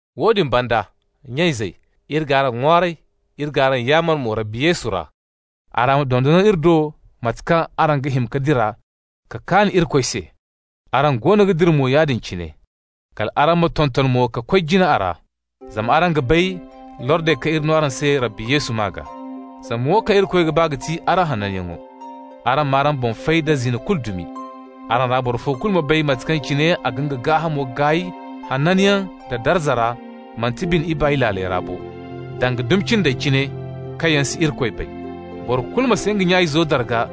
Woodin banda, nya-izey, iri g'araŋ ŋwaaray, iri g'araŋ yaamar mo Rabbi Yesu ra. Araŋ dondon iri do mate kaŋ araŋ ga hima ka dira ka kaan Irikoy se, araŋ goono ga dira mo yaadin cine. Kal araŋ ma tonton mo ka koy jina a ra. Zama araŋ ga bay lordey kaŋ iri no araŋ se Rabbi Yesu maa gaa. Zama wo kaŋ Irikoy ga ba ga ti araŋ hananyaŋo. Araŋ m'araŋ boŋ fay da zina dumi kulu. Araŋ ra boro fo kulu ma bay mate kaŋ cine a ga nga gaahamo gaay hananyaŋ da darza ra, manti bine ibaay laaley ra bo, danga dumi cindey cine kaŋ yaŋ si Irikoy bay. Boro kulu ma si nga nya-izo darga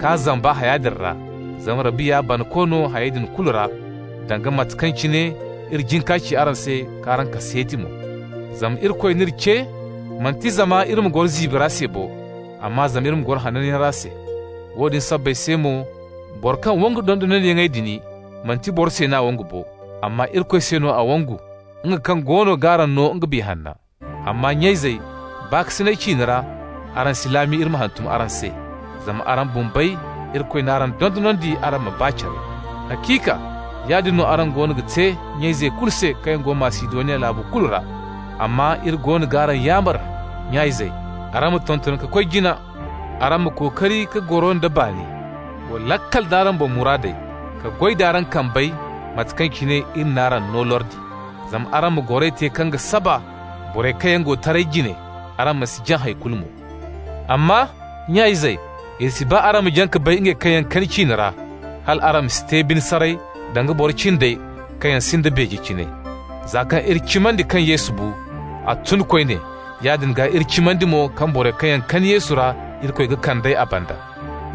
k'a zamba haya din ra, zama Rabbi ya banako no hayey din kulu ra, danga mate kaŋ cine iri jin ka ci araŋ se k'araŋ kaseeti mo. Zama Irikoy n'iri ce, manti zama iri ma goro ziibi ra se bo, amma zama iri ma goro hananyaŋ ra se. Woodin sabbay se mo boro kaŋ wangu dondonandiyaŋey din, manti boro se n'a wangu bo, amma Irikoy se no a wangu, nga kaŋ goono g'araŋ no nga Biya Hanna. Amma nya-izey baakasina ciine ra, araŋ si laami iri ma hantum araŋ se, zama araŋ bumbey, Irikoy n'araŋ dondonandi araŋ ma ba care. Haciika yaadin no araŋ goono ga te nya-izey kulu se kaŋ go Masidoniya laabo kulu ra. Amma iri goono g'araŋ yaamar, nya-izey, araŋ ma tonton ka koy jina. Araŋ ma kookari ka goro nda baani. Wa laakal d'araŋ boŋ muraadey, ka goy d'araŋ kambey mate kaŋ cine iri n'araŋ no lordi. Zama araŋ ma goray te kaŋ ga saba borey kaŋ yaŋ go taray jine, araŋ ma si jaŋ hay kulu mo. Amma, nya-izey, iri si ba araŋ ma jaŋ ka bay ngey kaŋ yaŋ kani ciine ra, hal araŋ ma si te bine saray danga boro cindey kaŋ yaŋ sinda beeje cine. Za kaŋ iri cimandi kaŋ Yesu bu, a tun koyne, yaadin gaa iri cimandi mo kaŋ borey kaŋ yaŋ kani Yesu ra, Irikoy ga kand'ey a banda.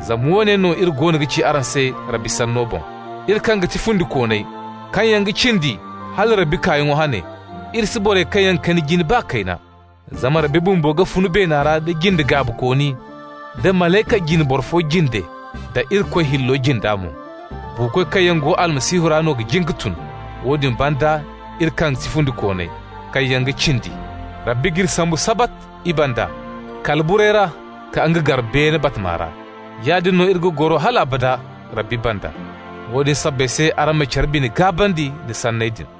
Zama woone no iri goono ga ci araŋ se Rabbi sanno boŋ: iri kaŋ ga ti fundikooney, kaŋ yaŋ ga cindi hala Rabbi kaayaŋo hane, iri si borey kaŋ yaŋ kani jin baa kayna. Zama Rabbi bumbo ga fun beena ra da jinde gaabikooni, da malayka jine boro fo jinde, da Irikoy hillo jinda mo. Buukoy kaŋ yaŋ go Almasihu ra no ga jin ka tun. Woodin banda iri kaŋ ga ti fundikooney, kaŋ yaŋ ga cindi, Rabbi g'iri sambu sabat i banda kala burey ra ka nga gar beene batama ra. Yaadin no iri ga goro hal abada Rabbi banda. Woodin sabbay se araŋ ma care bine gaabandi nda sanney din.